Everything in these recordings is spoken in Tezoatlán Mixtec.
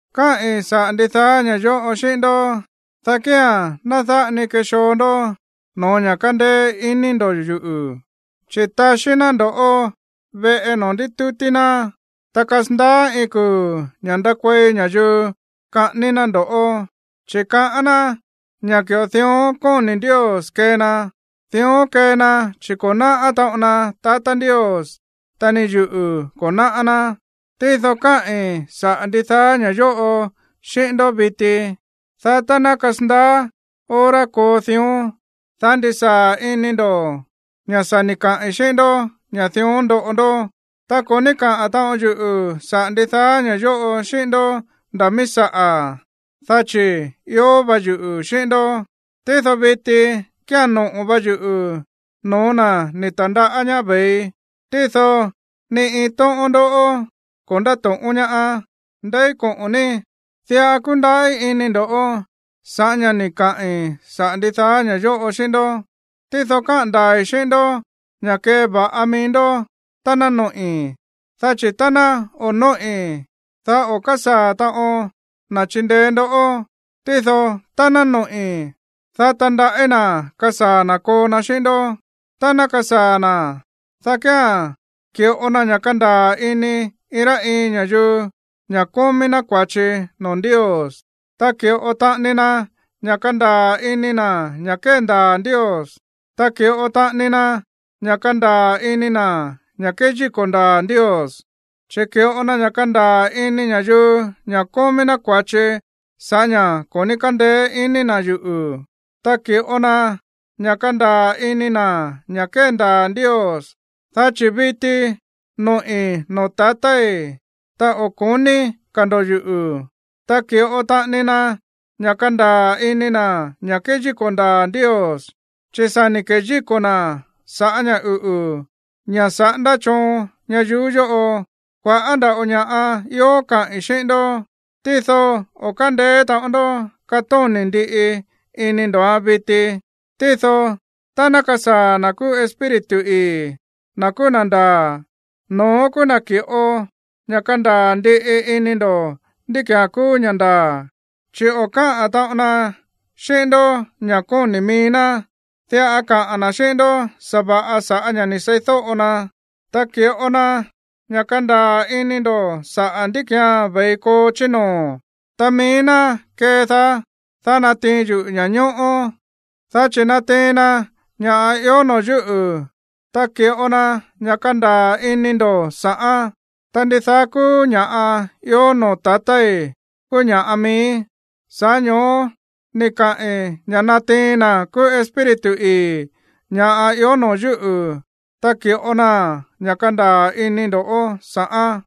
’Káꞌi̱n saꞌa̱ ndidaá ña̱ yóꞌo xíꞌín ndó, dá kía̱n ná dáꞌa ni kexoo ndó no̱ó ña̱ kándéé iní ndo̱ yuꞌu̱, chi̱ taxí ná ndo̱ꞌó veꞌe noo̱ ndítútí ná, ta kasandaá iin kuu̱ ña̱ ndakuei ña̱yuu kaꞌání ná ndo̱ꞌó, chi̱ kaꞌán ná ña̱ ki̱ꞌo dión kóni̱ Ndios kee na. Dión kee na, chi̱ ko̱ náꞌá taꞌon na tatá Ndios, ta ni yuꞌu̱ ko̱ náꞌá ná. Tído káꞌi̱n saꞌa̱ ndidaá ña̱ yóꞌo xíꞌín ndó viti, dá tá ná kasandaá hora koo dión, dá ndisaa̱ ini ndo̱ ña̱ sa̱ ni̱ kaꞌi̱n xíꞌín ndó ña̱ dión ndoꞌo ndó. ’Ta ko̱ ní káꞌa̱n taꞌon yuꞌu̱ saꞌa̱ ndidaá ña̱ yóꞌo xíꞌín ndó nda̱ mií saꞌa̱, dá chi̱ ió va yuꞌu̱ xíꞌín ndó. Tído viti kía̱n noꞌo̱ va yuꞌu̱ no̱ó na̱ ni̱ ta̱ndaꞌá ñaá ve̱ii, tído ni iin tóꞌón ndó ko̱ ndáto̱ꞌón ñaá: “¿Ndeí koꞌo̱n ní?” Diꞌa kúndaꞌí ini ndo̱ sa̱ꞌá ña̱ ni̱ kaꞌi̱n saꞌa̱ ndidaá ña̱ yóꞌo xíꞌín ndó. Tído káꞌa̱n ndaa̱i̱ xíꞌín ndó ña̱ keva̱ꞌa mií ndó tá ná noꞌi̱, dá chi̱ tá ná o̱ nóꞌi̱n, dá o̱ kásaa̱ taꞌon na̱ chindeé ndoꞌó. Tído tá ná noꞌi̱, dá tandaꞌí na̱ kasaa̱ na̱ koo na xíꞌín ndó. Tá ná kasaa̱ na̱, dá kía̱n ki̱ꞌo na ña̱ kandaa̱ ini iin rá iin ña̱yuu ña̱ kómí ná kua̱chi noo̱ Ndios, ta ki̱ꞌo taꞌani na ña̱ kandaa̱ ini na̱ ña̱ kéndaa̱ Ndios, ta ki̱ꞌo taꞌani na ña̱ kandaa̱ ini na̱ ña̱ kéyíko̱ ndaa̱ Ndios. Chi̱ ki̱ꞌo na ña̱ kandaa̱ ini ña̱yuu ña̱ kómí ná kua̱chi sa̱ꞌá ña̱ ko̱ ní kándeé ini na̱ yuꞌu̱, ta ki̱ꞌo na ña̱ kandaa̱ ini na̱ ña̱ kéndaa̱ Ndios, dá chi̱ viti noꞌi̱ noo̱ tatái̱, ta o̱ ko̱ní ka̱ ndo̱ yuꞌu̱. Ta ki̱ꞌo taꞌani na ña̱ kandaa̱ ini na̱ ña̱ kéyíko̱ ndaa̱ Ndios, chi̱ sa̱ ni̱ keyíko̱ na̱ sa̱ꞌá ña̱ uꞌu̱, ña̱ saꞌándá choon ñayuú yóꞌo. ’Kua̱ꞌá nda̱ꞌo ña̱ꞌa ió kaꞌi̱n xíꞌín ndó, tído o̱ kándeé taꞌon ndó katóni̱ ndiꞌi ini ndo̱án viti. Tído tá ná kasaa̱ na̱ kúú Espíritu ii̱, na̱ kúú na̱ ndaa̱, no̱ón kúú na̱ ki̱ꞌo ña̱ kandaa̱ ndiꞌi ini ndo̱ ndí ki̱án kúú ña̱ ndaa̱. Chi̱ o̱ káꞌa̱n taꞌon na xíꞌín ndó ña̱ kóni̱ mií ná, diꞌa kaꞌa̱n na̱ xíꞌín ndó sa̱va̱ꞌa sa̱ꞌá ña̱ ni̱ seídóꞌo na. Ta ki̱ꞌo na ña̱ kandaa̱ ini ndo̱ saꞌa̱ ndí ki̱án ve̱i koo chí noo̱. Ta mií ná kedaá, dá natiin yuꞌu̱ ña̱ñóꞌó, dá chi̱ natiin na ña̱ ió noo̱ yúꞌu̱, ta ki̱ꞌo na ña̱ kandaa̱ ini ndo̱ sa̱ꞌán. Ta ndidaá kúú ña̱ꞌa ió noo̱ tatái̱ kúú ña̱ꞌa miíí, sa̱ꞌá ño̱ó ni̱ kaꞌi̱n ña̱ natiin na̱ kúú Espíritu ii̱ ña̱ ió noo̱ yúꞌu̱, ta ki̱ꞌo na ña̱ kandaa̱ ini ndo̱ sa̱ꞌán.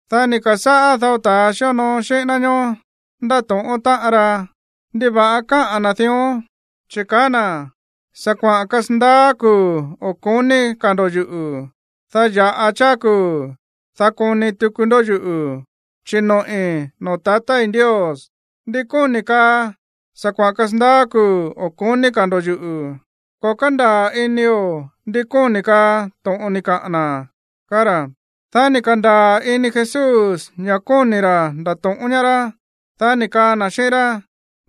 Dá ni̱ ka̱sáꞌá dao ta̱ xíonoo xíꞌín ná ñoó ndáto̱ꞌón táꞌan ra: ―¿Ndiva̱ꞌa káꞌa̱n na̱ dión? Chi̱ kaá na̱: “Sa̱ kuaꞌa̱n kasandaá kuu̱ o̱ ko̱ní ka̱ ndo̱ yuꞌu̱, dá ya̱ꞌa cháá kuu̱, dá koni tuku ndó yuꞌu̱, chi̱ noꞌi̱ noo̱ tatái̱ Ndios.” ¿Ndi kóni̱ kaa: “Sa̱ kuaꞌa̱n kasandaá kuu̱ o̱ ko̱ní ka̱ ndo̱ yuꞌu̱”? Ko̱ kándaa̱ inio̱ ndi kóni̱ kaa to̱ꞌon ni̱ kaꞌa̱n na̱ ―kaá ra̱. Dá ni̱ ka̱ndaa̱ ini Jesús ña̱ kóni̱ ra̱ ndato̱ꞌón ñaá rá. Dá ni̱ kaa na̱ xíꞌín rá: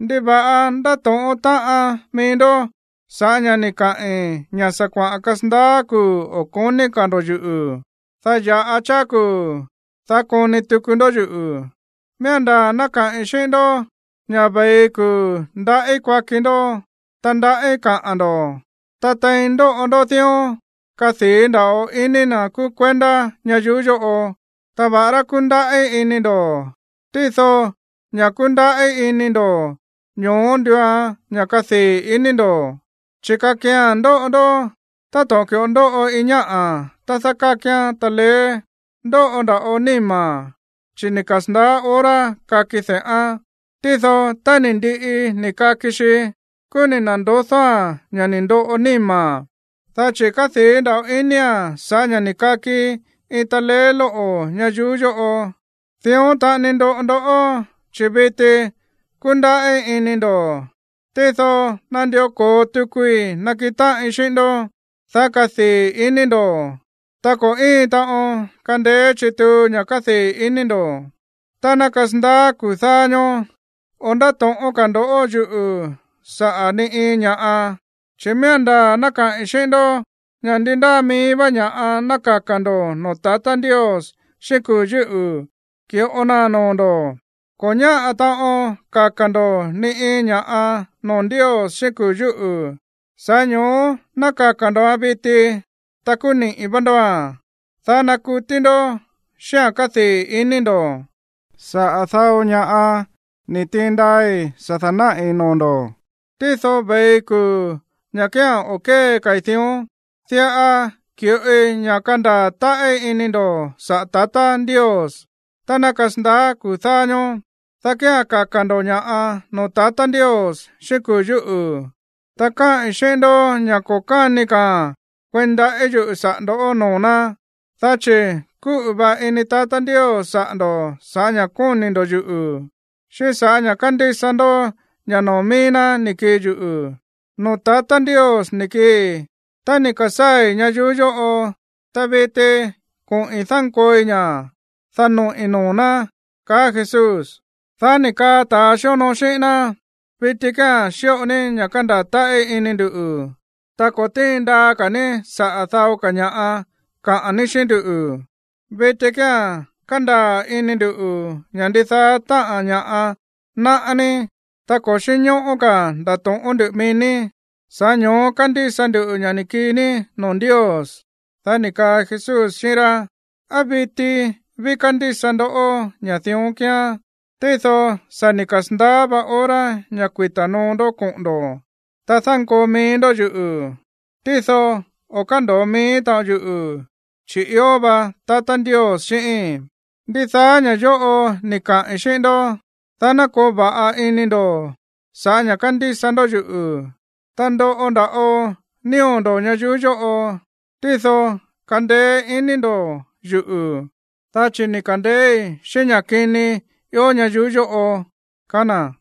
―¿Ndiva̱ꞌa ndáto̱ꞌón táꞌan mií ndó sa̱ꞌá ña̱ ni̱ kaꞌi̱n ña̱: “Sa̱ kuaꞌa̱n kasandaá kuu̱ o̱ ko̱ní ka̱ ndo̱ yuꞌu̱, dá ya̱ꞌa cháá kuu̱, dá koni tuku ndó yuꞌu̱”? Miía̱n ndaa̱ ná kaꞌi̱n xíꞌín ndó ña̱ ve̱i kuu̱ ndaꞌí kuaki ndó, ta ndaꞌí kaꞌa̱n ndo̱, ta tein ndoꞌo ndó dión, kadii̱ nda̱ꞌo ini na̱ kúú kuendá ñayuú yóꞌo. Ta va̱ꞌará kundaꞌí ini ndo̱, tído ña̱ kundaꞌí ini ndo̱, ño̱ó nduuan ña̱ kadii̱ ini ndo̱. Chi̱ kakia̱n ndoꞌo ndó táto̱ꞌon ki̱ꞌo ndóꞌo iin ñáꞌa̱ tá dákákián taleé, ndóꞌo nda̱ꞌo níma̱n, chi̱ ni̱ kasa̱ndaá hora kaki de̱ꞌán. Tído tá ni̱ ndiꞌi ni̱ kaki xi, kúú ni̱ na̱ndodóa̱n ña̱ ni̱ ndoꞌo níma̱n, dá chi̱ kádii̱ nda̱ꞌo inia̱n sa̱ꞌá ña̱ ni̱ kaki iin taleé lóꞌo̱ ñayuú yóꞌo. Dión taꞌani ndoꞌo ndoꞌó, chi̱ viti kúndaꞌí ini ndo̱, tído nandió ko̱o tukui nakiꞌin táꞌin xíꞌín ndó, dá kadii̱ ini ndo̱, ta ko̱ íin taꞌon kandeé chituu ña̱ kadii̱ ini ndo̱. ’Tá ná kasandaá kuu̱ dáá ñóó, o̱ ndáto̱ꞌón ka̱ ndo̱ yuꞌu̱ saꞌa̱ ni iin ña̱ꞌa, chi̱ miía̱n ndaa̱ ná kaꞌi̱n xíꞌín ndó ña̱ ndi ndáa mií vá ña̱ꞌa ná kaka̱ ndo̱ noo̱ tatá Ndios xíꞌín kuu̱ yúꞌu̱, ki̱ꞌo naa̱n noo̱ ndo̱. Ko̱ ñáꞌa̱ taꞌon kaka̱ ndo̱ ni iin ña̱ꞌa noo̱ Ndios xíꞌín kuu̱ yúꞌu̱, sa̱ꞌá ño̱ó ná kaka̱ ndo̱án viti, ta kúú niꞌi̱ vá ndóa̱n, dá ná kutí ndó xíꞌa̱n kadii̱ ini ndo̱. ’Saꞌa̱ dao ña̱ꞌa ni̱ tiin ndaai̱ sa̱ da̱náꞌi̱ noo̱ ndo̱. Tído ve̱i kuu̱ ña̱ kía̱n o̱ kée ka̱i̱ dión. Diꞌa ki̱ꞌoi ña̱ kandaa̱ táꞌí ini ndo̱ saꞌa̱ tatá Ndios. Tá ná kasandaá kuu̱ dáá ñóó, dá kía̱n kaka̱ ndo̱ ña̱ꞌa noo̱ tatá Ndios xíꞌín kuu̱ yúꞌu̱, ta kaꞌi̱n xíꞌín ndó ña̱ ko̱ káni ka̱a̱n kueí ndaꞌí yuꞌu̱ saꞌa̱ ndo̱ noo̱ ná, dá chi̱ kúꞌu̱ va ini tatá Ndios saꞌa̱ ndo̱ sa̱ꞌá ña̱ kóni̱ ndo̱ yuꞌu̱, xíꞌín sa̱ꞌá ña̱ kándísa ndó ña̱ noo̱ mií ná ni̱ kii yuꞌu̱. Noo̱ tatá Ndios ni̱ kiii, ta ni̱ ka̱sáa̱i̱ ñayuú yóꞌo. Ta viti koꞌi̱n dánkooi ña̱, dá noꞌi̱ noo̱ ná ―kaá Jesús. Dá ni̱ kaa ta̱ xíonoo xíꞌín ná: ―Viti kía̱n xíꞌo ní ña̱ kandaa̱ táꞌí ini ndu̱, ta ko̱ tíin ndaa ka̱ ní saꞌa̱ dao ña̱ꞌa kaꞌa̱n ní xíꞌín ndú. Viti kía̱n kándaa̱ ini nduꞌu̱ ña̱ ndidaá táꞌa̱n ña̱ꞌa náꞌá ní, ta ko̱ xínñóꞌó ka̱a̱n ndato̱ꞌón ndú mií ní, sa̱ꞌá ño̱ó kándísa nduꞌu̱ ña̱ ni̱ kii ní noo̱ Ndios. Dá ni̱ kaa Jesús xíꞌín rá: ―¿Á viti ví kándísa ndó ña̱ dión kíán? Tído sa̱ ni̱ kasa̱ndaá vá hora ña̱ kuita̱ noo ndó koꞌo̱n ndo̱, ta dánkoo mií ndó yuꞌu̱. Tído o̱ kándo̱o mií taꞌon yuꞌu̱, chi̱ ió va tatá Ndios xíꞌíín. Ndidaá ña̱ yóꞌo ni̱ kaꞌi̱n xíꞌín ndó, dá ná koo va̱ꞌa ini ndo̱ sa̱ꞌá ña̱ kándísa ndó yuꞌu̱. Ta ndoꞌo nda̱ꞌo nío̱ ndo̱ ñayuú yóꞌo, tído kandeé ini ndo̱ yuꞌu̱, dá chi̱ ni̱ ka̱ndeéí xíꞌín ña̱ kini ió ñayuú yóꞌo ―kaá na̱.